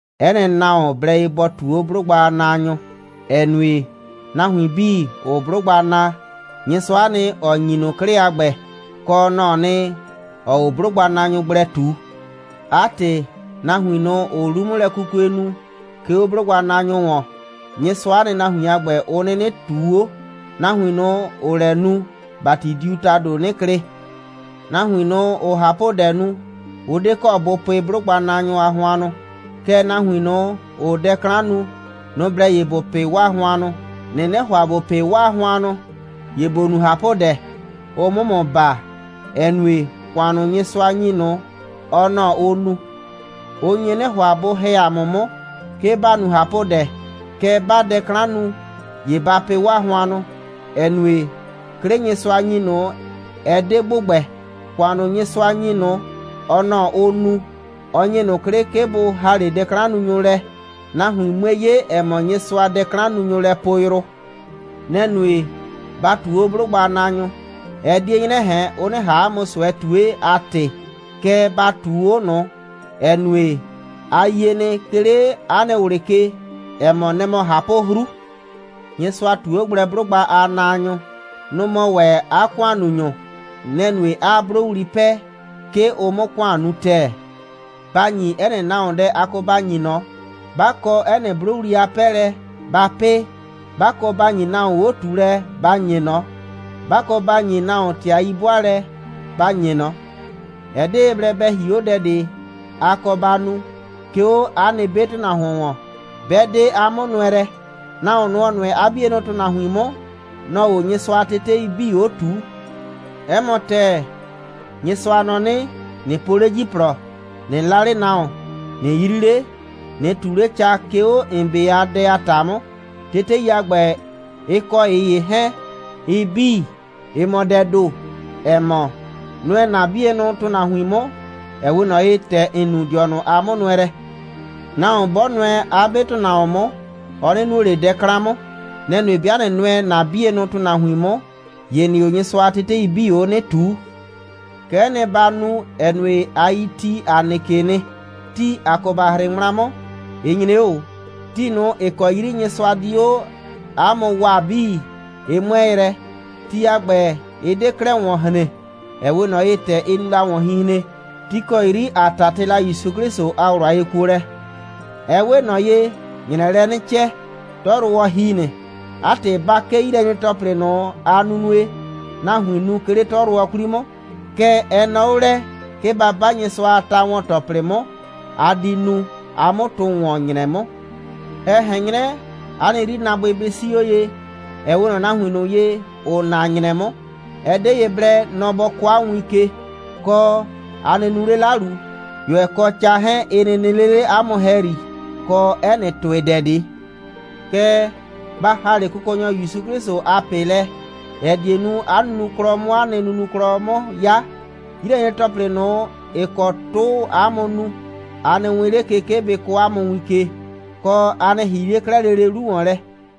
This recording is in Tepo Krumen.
'Ɛ nɩ nahuon blɛ ye bɔ ꞊tuu 'o 'blʋgba a naanyʋ, ‑ɛ nue, nahuin 'bii, ‑ʋʋ 'blʋgba naa, Nyɩsʋa'a nɩ, ‑ɔ ‑nyi ꞊nʋ 'klɩ a ‑gbɛ, kɔ, nɔ‑ɔ nɩ, ‑ɔɔ 'o 'blʋgbanaanyʋ gblɛ ꞊tu. 'A ‑tɩ, nahuin ꞊nʋ, ‑ʋʋ 'lu'mʋlɛkukue nu, 'ke 'o 'blʋgbanaanyʋ ‑wɔn, Nyɩsʋa'a nɩ, nahuin a ‑gbɛ, ʋ 'nɩnɩ ꞊tuu 'o. Nahuin ꞊nʋ, ‑ʋʋ lɛ nu, ‑bati diu ‑tado 'nɩ klɩ. Nahuin ꞊nʋ, ‑ʋʋ ꞊hapʋdɛ nu, ʋ 'de kɔ bʋ pɩ 'blʋgbanaanyʋ a hʋannʋ. Kɛɛ, nahuin ꞊nʋ, ‑ʋʋ dɛ 'klan nu, nʋ‑ blɛ ye ‑bʋ pɩ 'waa hʋannʋ. ꞊Nɩnɩ ‑hʋa ‑bo pɩ 'waa hʋannʋ, ‑ye ‑bo nu ꞊hapʋdɛ, ʋ 'mʋ ‑mʋ baa, ‑ɛ nue, ‑kʋan ꞊nʋ, Nyɩsʋa ‑nyi ꞊nʋ, ɔ nɔ‑ ʋʋ nu. Ʋ nye 'nɩ ‑hʋa, bʋ ‑hɛ 'a mʋ 'mʋ, 'ke ba nu ꞊hapʋdɛ. Kɛɛ, 'baa dɛ 'klan nu, ‑ye ba pɩ 'waa hʋannʋ, ‑ɛ nue, 'klɩ Nyɩsʋa ‑nyi ꞊nʋ, ɛ 'de ‑gbʋgbɛ. ‑Kʋan ꞊nʋ, Nyɩsʋa ‑nyi ꞊nʋ, ɔ nɔ‑ ʋʋ nu. Ɔ ‑nyi ꞊nʋ 'klɩ, 'ke bʋ ‑ha 'le dɛ'klannunyʋ lɛ, nahuin 'mue 'ye, ‑ɛ mɔ, Nyɩsʋaa dɛ'klannunyʋ lɛ poo yrʋ. Nɛ‑ nue, ba ꞊tuu 'o 'blʋgbanaanyʋ. Ɛ 'die 'nyrɛ ꞊hɛn, ʋ 'nɩ ꞊han 'a mʋ ꞊sʋɛ ꞊tue a ‑tɩ, kɛɛ, ba ꞊tuu 'o ꞊nʋ, ‑ɛ nue, a yie nɩ, 'ke 'le 'a nɩ ꞊wlɩ ke, ‑ɛ mɔ, nɛ‑ mɔ ꞊hapʋ'hru. Nyɩsʋa ꞊tu 'o gblɛ 'blʋgba a naanyʋ. Nʋ‑ mɔ ‑wɛ 'a ‑kʋannunyʋ. Nɛ‑ nue, 'aa 'blʋwli 'pɛɛ, 'ke ʋ 'mʋ ‑kʋan nu ‑tɛɛ. Ba ‑nyi 'ɛ nɩ nahuon dɛ a kɔ ba ‑nyi ꞊nɔ. 'Ba kɔ 'ɛ nɩ 'blʋwli a 'pɛɛlɛ, ba 'pɩɩ. 'Ba kɔ ba ‑nyi nahuon 'o꞊tuulɛ, ba ‑nye ꞊nɔ. 'Ba kɔ ba ‑nyi nahuon ‑tɩ a 'yi'bʋaalɛ, ba ‑nye ꞊nɔ. Ɛ 'de ye blɛ bɛ hie 'o dɛ ꞊de, a kɔ ba nu, 'ke 'o 'a nɩ 'be ‑tʋnahuon ‑wɔn, 'bɛ 'de 'a 'mʋnʋɛlɛ. Nahuon ꞊nʋ, ‑ɔ nʋɛ 'a 'bienʋ ‑tʋnahuin 'mʋ, nɔ‑ɔ 'o Nyɩsʋa a tetei 'bii 'o ꞊tuu. 'Ɛ mɔ ‑tɛɛ, Nyɩsʋa nɔ 'nɩ: ꞊Nɩ po 'le ‑jiplɔ, ꞊nɩ 'la 'le nahuon, ꞊nɩ 'yri 'le, ꞊nɩ ꞊tu 'le ca, 'ke 'o ‑n 'be a dɛ a ‑ta 'mʋ. Tetei a ‑gbɛ, ɩ kɔ ꞊ɩ ‑ye 'hɛɛn, ɩ 'bii, ɩ mɔ dɛɛ ‑do, ‑ɛ mɔ: Nʋɛ ‑na 'bienʋ ‑tʋnahuin 'mʋ, ‑ɛ 'we ꞊nɔ ye, ‑tɛ ‑n nu ‑n dɩɔnʋ a 'mʋnʋɛlɛ. Nahuon 'bɔ nʋɛ 'a 'be ‑tʋnahuon 'mʋ, ɔ 'nɩ nuo ꞊le dɛ 'klan 'mʋ. Nɛ‑ nue, 'bɩa ꞊nɩ nʋɛ ‑na 'bienʋ ‑tʋnahuin 'mʋ, ‑ye ‑nɩɩ 'o Nyɩsʋa a tetei 'bii 'o 'nɩ ꞊tuu. Kɛ'ɛ nɩ ba nu, ‑ɛ nue, a yi ti, ‑a nɩ ke nɩ. Ti, a kɔ ba 'hrɩ ŋmla 'mʋ, ɩ nyre 'o ꞊o. Ti ꞊nʋ, ‑ɩ kɔ 'yri Nyɩsʋa di 'o ‑a mʋ waa 'bii, ɩ 'mʋɛɛ yrɛ. Ti a ‑gbɛ, ɩ 'de 'klɛɛ ‑wɔn hren, ‑ɛ 'we ꞊nɔ ye, ‑tɛ ɩ nu la ‑wɔnhinhren, ti ‑kɔ 'yri ‑a 'tatɩ la ‑Yusu 'Klɩsʋ a ꞊wlʋ a yekuolɛ. Ɛ 'we ꞊nɔ ye, ‑nyrɛɛ lɛ 'nɩ cɛ, 'tɔyrʋwɔ ‑hi nɩ. 'A ‑tɩ, ‑ba 'kee 'yilɛnyre‑tɔplɩ ꞊nʋ a nunue, nahuiin nu, 'ke 'le 'tɔyrʋwɔ 'kwli 'mʋ. Kɛɛ, ɛ nɔɔ 'o lɛ, 'ke ‑ba 'ba Nyɩsʋa a ta‑wɔn‑tɔplɩ 'mʋ, ‑a di nu, ‑a 'mʋ tʋ ‑wɔn ‑nyrɛ 'mʋ. Ɛ ꞊hɛn 'nyrɛ, ‑a nɩ 'yrinaabʋɩ bɩ 'sii 'o ye, ‑ɛ 'we ꞊nɔ nahuin ꞊nʋ ye, ‑ʋʋ na ‑nyrɛ 'mʋ. Ɛ 'de ye blɛ, nɔ bɔ kɔɔ ‑a mʋ win ke, kɔ, ‑a nɩ nu 'le 'lalu, ꞊yʋɛ kɔ ca 'hɛɛn, ɩ nɩ nɩ 'le 'le ‑a mʋ ‑hɛyri, kɔ 'ɛ nɩ ‑tʋɩdɛ ꞊de. Kɛɛ, ba ‑ha 'le Kʋkɔnyɔ ‑Yusu 'Klɩsʋ a ꞊pɩ lɛ, ‑ɛ die nu, 'a nunuklɔ 'mʋ 'a nɩ nunuklɔ 'mʋ 'ya. 'Yilɛnyre‑tɔplɩ ꞊nʋ, ‑ɩ kɔ 'tʋʋ 'a mʋ nu, a nɩ wɛɛn 'le ke, 'ke bɩ kɔɔ 'a mʋ win ke, kɔ, a nɩ ‑hii 'le 'klɛɛ lele 'lu ‑wɔn lɛ.